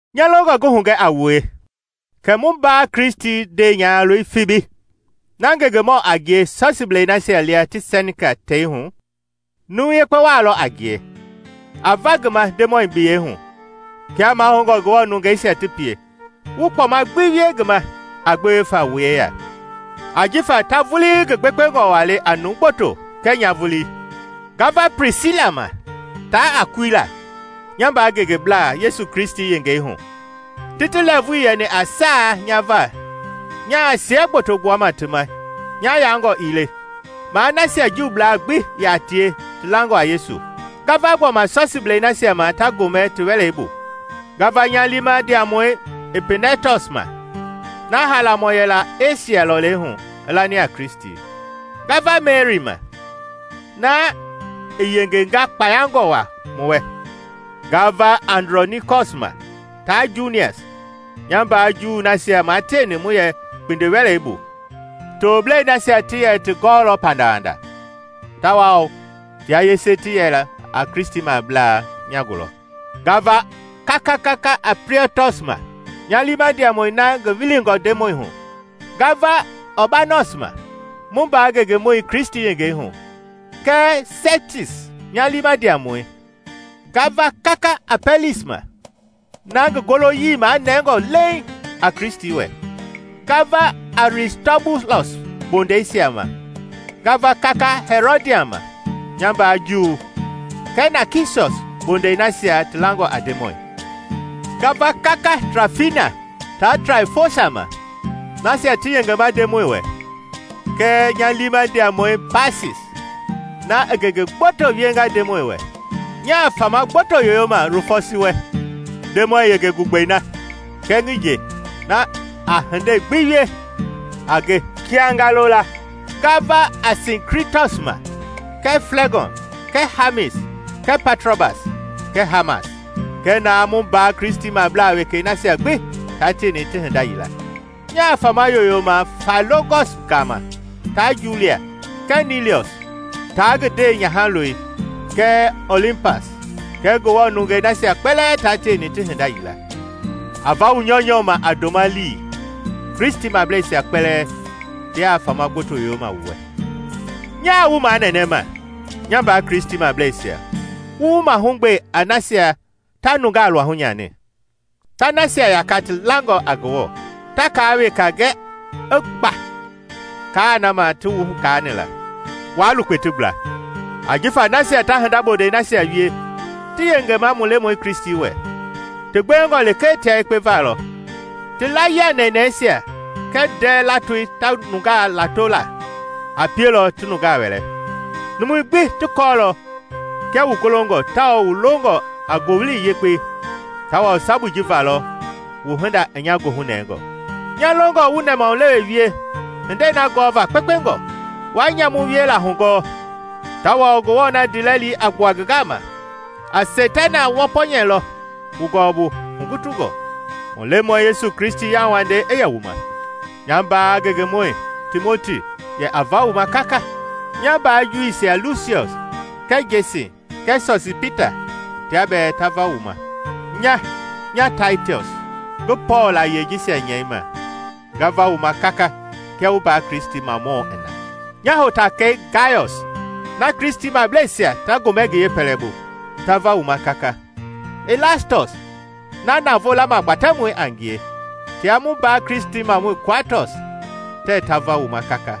Nya longɔ ngi hugɛ a wue kɛ mu mbaa Kristi nyahaloi Fibi na ngengemɔ a ngie Sɔsiiblei nasia lia ti Sɛnkia teihu, numu yekpe waa lɔ a ngie. A va ngi ma Ndemɔi biyɛi hu, kia mahoungɔ Ngewɔ nungeisia ti pie, wu kpɔma gbi wie ngi ma a gbewe fa wu yeya; ajifa ta vulii ngi gbekpengɔ waa le a numu gboto kɛɛ nya vulii. Nga va Plisila ma taa Akuila, nya mbaa ngengeblaa Yesu Kristi yengei hu; ti ti lɛɛvui yɛni a saa nya va nyaa siɛ gboto gbuama ti ma nya yaangɔ ii le, maa nasia Juublaa gbi yaa tie ti langɔ a Yesu. Nga va gbɔma Sɔsiiblei nasia ma ta gomɛ ti wɛlei bu. Nga va nya liima ndiamɔi Ipinɛtɔs ma, na haalamɔ yɛla Esia lɔlei hu i lani a Kristi. Nga va Meri ma, na i yengenga kpayangɔ waa wu wɛ. Nga va Andrɔnikɔs ma taa Junias, nya mbaa Juu nasia maa tieni mu yɛ kpindiwɛlei bu; toblɛisia ti yɛ ti gɔɔlɔ pandawanda, tawao tia yese ti yɛla a Kristimablaa nya gulɔ. Nga va kaka Amplietɔs ma, nya liima ndiamɔi na ngi wilingɔ Ndemɔi hu. Nga va Ɔɔbanɔs ma, mu mbaa ngengemɔi Kristi yengei hu, kɛɛ Stekis, nya liima ndiamɔi. Nga va kaka Apɛlis ma, na ngi goloyii magɛngɔ leeŋ a Kristi wɛ. Nga va Aristɔbulɔs bondɛisia ma. Nga va kaka Hɛrɔdiɔn ma, nya mbaa Juu, kɛɛ Nakisɔs bondɛi nasia ti langɔ a Ndemɔi. Nga va kaka Trafina taa Traifosa ma, nasia ti yengema Ndemɔi wɛ, kɛɛ nya liima ndiamɔi Paasis, na i ngenge gboto wienga Ndemɔi wɛ. Nyaa fama gboto yoyoma Rufɔsi wɛ, Ndemɔi yenge gugbei na, kɛɛ ngi nje, na a hindei gbi wie a nge kia nga lola. Nga va Asinkritɔs ma kɛɛ Flɛgɔn kɛɛ Hamis kɛɛ Patrɔbas kɛɛ Hamas kɛɛ naa mu mbaa Kristimablaa wekei nasia gbi taa tieni ti hinda yila. Nyaa fama yoyoma Failɔogɔs gama taa Julia, kɛɛ Niliɔs taa ngi ndewenyahaloi, kɛɛ Olimpas kɛɛ Ngewɔ nungei nasia kpɛlɛɛ taa tieni ti hinda yila. A va wu nyɔunyɔ ma a ndoma-lii. Kristimableisia kpɛlɛɛ tia fama gboto yoyoma wu wɛ. Nyaa wu manɛnɛma, nya mbaa Kristimableisia wu wu mahugbe a nasia ta nungaa luahu nyani, ta nasia yaka ti langɔ a Ngewɔ, ta kaa weka gɛ i gba kaa na ma ti wu gaani la; waa lukpe ti gbla. Ajifa nasia ta hinda bondɛi nasia wie tii yengema mu Lemɔi Kristi wɛ, ti gbewengɔ lekee tia yekpe valɔ. Ti layia nɛnɛisia kɛɛ ndɛ latoi ta nungaa lato la a pielɔ ti nungaa wɛlɛ. Numui gbi ti kɔɔlɔ kia wu golongɔ tawao wu longɔ a Ngowili Yekpei tawao sabui ji va lɔ wu hinda i nya goohu nɛngɔ. Nya longɔ wu nɛmahulewe wie hindei na gɔɔva kpekpengɔ, waa nyamu wiela hugɔɔ. Tawao Ngewɔ na ndiilɛli a gbua ngi gama, a Seitana wɔpɔnyɛlɔ wu gɔɔbu hugutungɔ. Mu Lemɔi Yesu Kristi yauwandei i yɛ wu ma. Nya mbaa ngengemɔi Timoti yɛ a va wu ma kaka. Nya mbaa Juuisia Lusiɔs kɛɛ Jesin kɛɛ Sosipeta tia bɛɛ ta va wu ma. Nya nya Tatiɔs, ngi Pɔɔl layie jisia nyɛima nga va wu ma kaka kia wu mbaa Kristimamɔɔ i na. Nya hotakɛi Gayɔs, na Kristimableisia ta gomɛ ngi yeepɛlɛbu, ta vama wu ma kaka; Ilastɔs na navoo lamagbatɛmɔi a ngie tia mu mbaa Kristimɔi Kuaatɔs tɛɛ ta va wu ma kaka. [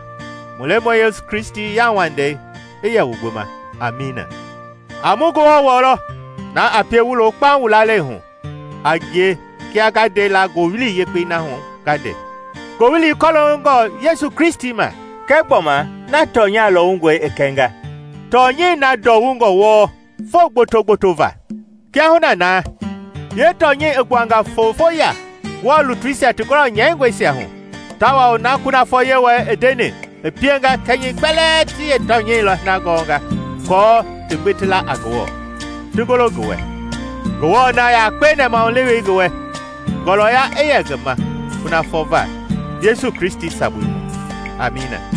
Mu Lemɔi Yesu Kristi yauwandei i yɛ wu gbi ma. Amiina.] A mu Ngewɔ wɔlɔ! Na a pie wu lo kpaŋ wu lalei hu a ngie kia nga nde la Ngowili Yekpei na hu nga nde, Ngowili kɔloongɔ Yesu Kristi ma kɛ gbɔma na tɔnya lɔwungɔi i kɛnga, tɔnyɛi na ndɔwungɔ wɔɔ foo gboto-gboto va. Kiahuna na yeetɔnyɛi i gbuanga fofoya Ngewɔ lutuisia ti gɔlɔ nyɛingɔisia hu, tawao na kunafɔ Yewɔɛi i ndeni i pienga kɛnyɛi kpɛlɛɛ ti yeetɔnyɛi na gɔnga aako ti gbi ti la a Ngewɔ, ti golo ngi wɛ. Ngewɔ na yakpe nɛmahulewei ngi wɛ, ngɔlɔya i yɛ ngi ma kunafɔ va Yesu Kristi sabui hu! Amiina.